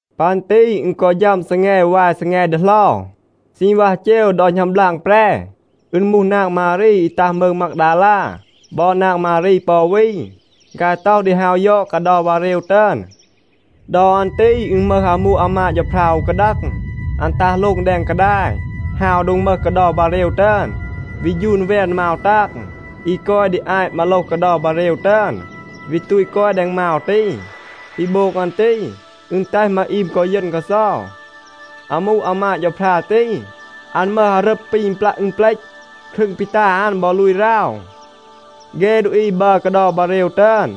ปัน ตี อึณ กอ ฌัม ซีแง วาย ซีแง ดีเหลา. ซีณวัห เจว ดอ หณัม บลาง แปร, อึณ มูห นาง มารี อี ตัห มืง มากดาลา บอ นาง มารี ปอ อู วี, ฆาย ต็อห ดี ฮาว ยอด กาเดา บาเรว ตึอน. ดอ อัน ตี อึณ มึห อามู อามาด เฌาพรา อู กาดัง, อัน ตัห โลง แดง กาดาย, ฮาว โดง มึห กาเดา บาเรว ตึอน, วี ฌูน แวน มาว ตาง อี กอย ดี อาต มาโลห กาเดา บาเรว ตึอน, วี ตูต กอย แดง มาว ตี. ปี โบง อัน ตี, อึณ แตห มาอีม กอ เยณ กาเซา. อามู อามาด เฌาพรา ตี, อัน มึห อารึบ ปี ปลัะ อึณเปลต. ครึง ปี ตา อัน บอ ลูย ราว. เฆ ดูอี บัร กาเดา บาเรว ตึอน,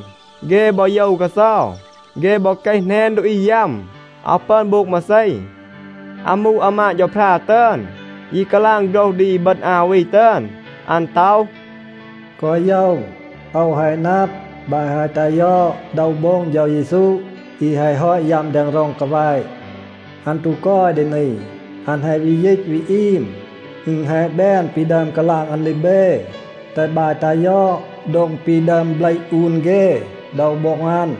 เฆ บอ โยว กาเซา. เฆ บอ เกห แหนน ดูอี ยัม, อาว ปึอน โบง มาเซ. อามู อามาด เฌาพรา ตึอน ยี กาลาง โฆรห ดี อีบึณ อา วี ตึอน. อัน ต็อห, “แกวะ โยว. โอว แฮะ นับ, บาย แฮะ ตัห ยอด โดว โบ็ง เฌา เยซู อี แฮะ ฮอต ยัม แดง ร็อง กาแวะ. อัน ตู กอย ดี นี, อัน แฮะ วี ยีต วี อีม. อึณ แฮะ แบน ปี ดึอม กาลาง อัน ดี เบ. แตห บาย ตัห ยอด โดง ปี ดึอม เบลห อูน เฆ โดว โบ็ง อัน.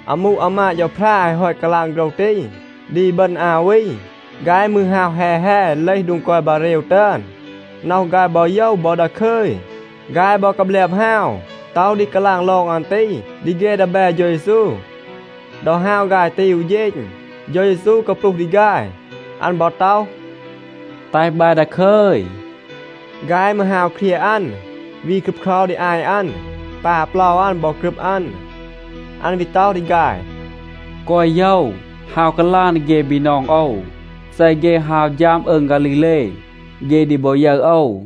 อามู อามาด เฌาพรา แฮะ ฮอต กาลาง โฆรห ตี ดี อีบึณ อา วี, ฆาย มืร ฮาว แฮ แฮ, เลห โดง กอย บาเรว ตึอน. น็อห ฆาย บอ โยว บอ ดาคึย. ฆาย บอ กาแบลบ ฮาว ต็อห ดี กาลาง ลอง อัน ตี ดี เฆ ดีแบ เฌา เยซู. ดอ ฮาว ฆาย ตี อู เฌณ, เฌา เยซู กาปลูห ดี ฆาย. อัน บอ ต็อห, “แตห บาย ดาคึย.” ฆาย มืร ฮาว เครียะ อัน, วี ครึบเครา ดี อาต อัน, ปา เปลา อัน บอ กรึบ อัน. อัน วี ต็อห ดี ฆาย, “แกวะ โยว. ฮาว กาลาง ดี เฆ บีนอง โอว, เซ เฆ ฮาว ฌัม อืง ฆาลีเล, เฆ ดี บอ ยึร โอว.”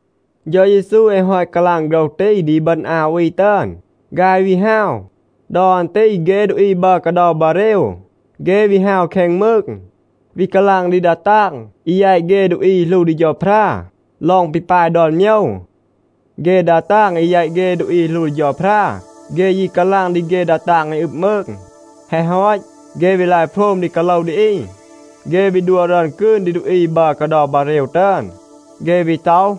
เฌา เยซู แฮะ ฮอต กาลาง โฆรห ตี ดี อีบึณ อา วี ตึอน, ฆาย วี ฮาว. ดอ อัน ตี เฆ ดูอี บัร กาเดา บาเรว, เฆ วี ฮาว แคง มืง, วี กาลาง ดี ดา ตาง อี แยต เฆ ดูอี อี หลู ดี เฌาพรา ลอง ปี ปาย ดอน โมยว. เฆ ดา ตาง อี แยต เฆ ดูอี อี หลู ดี เฌาพรา, เฆ ยี กาลาง ดี เฆ ดา ตาง อี อึบ มืง. แฮะ ฮอต, เฆ วี ลาย โพรม ดี กาโลว ดี อี. เฆ วี ดัว รึอน กืน ดี ดูอี บัร กาเดา บาเรว ตึอน. เฆ วี ต็อห,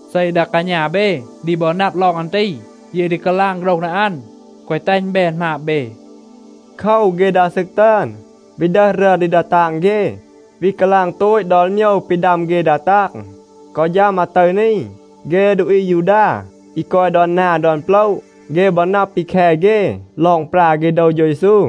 เซ ดา กาณา เบ ดี บอ นับ ลอง อัน ตี, เย ดี กาลาง โฆรห ดี อัน, แกวะ แตห อึณ แบน หมาบ เบ.” โคว, เฆ ดา ซึก ตึอน วี ดึห รึอน ดี ดา ตาง เฆ, วี กาลาง โตต ดอน โมยว ปี ดัม เฆ ดา ตาง. กอ ฌัม อาตึร นี, เฆ ดูอี อายูดา อี กอย ดอน นา ดอน โปละ, เฆ บอ นับ ปี แค เฆ ลอง ปรา เฆ โดว เฌา เยซู.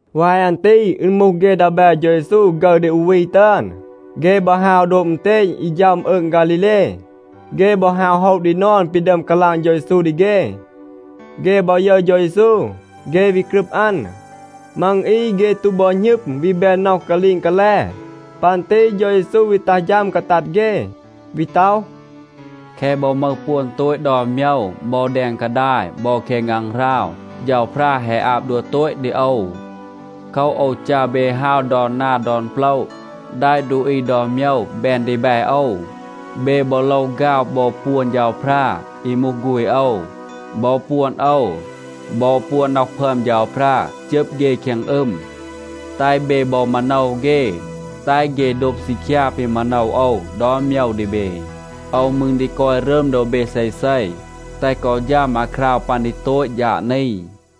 วาย อัน ตี อึณ มูห เฆ ดีแบ เฌา เยซู ฆึร ดี อู วี ตึอน, เฆ บอ ฮาว โดบ อึณเตณ อี ฌัม อืง ฆาลีเล. เฆ บอ ฮาว โฮะ ดี นอน ปี ดึอม กาลาง เฌา เยซู ดี เฆ. เฆ บอ ยึร เฌา เยซู, เฆ วี กรึบ อัน. มัง อี เฆ ตู บอ หณึม, วี แบน น็อห กาลีง กาแล. ปัน ตี เฌา เยซู วี ตัห ฌัม กาตัด เฆ, วี ต็อห, “แคะ บอ มึห ปวน โตต ดอน โมยว บอ แดง กาดาย บอ แคง ฆางหราว, เฌาพรา แฮะ อาบ ดัว โตต ดี โอว. โคว, โอว จัร เบ ฮาว ดอน นา ดอน โปละ, แดะ ดูอี ดอน โมยว แบน ดีแบ โอว. เบ บอ โลว ฆาว บอ ปวน เฌาพรา, อี มูห ฆูณ โอว บอ ปวน โอว บอ ปวน น็อห พึอม เฌาพรา, จึบ เฆ แคง อึม. แตห เบ บอ มาโนว เฆ, แตห เฆ โดบ ซีคยา ปี มาโนว โอว ดอน โมยว ดี เบ. โอว มืร ดี กอย รึม โดบ เบ เซเซ, แตห กอ ฌัม อาคราว ปัน ดี โตต ฌาด นี.”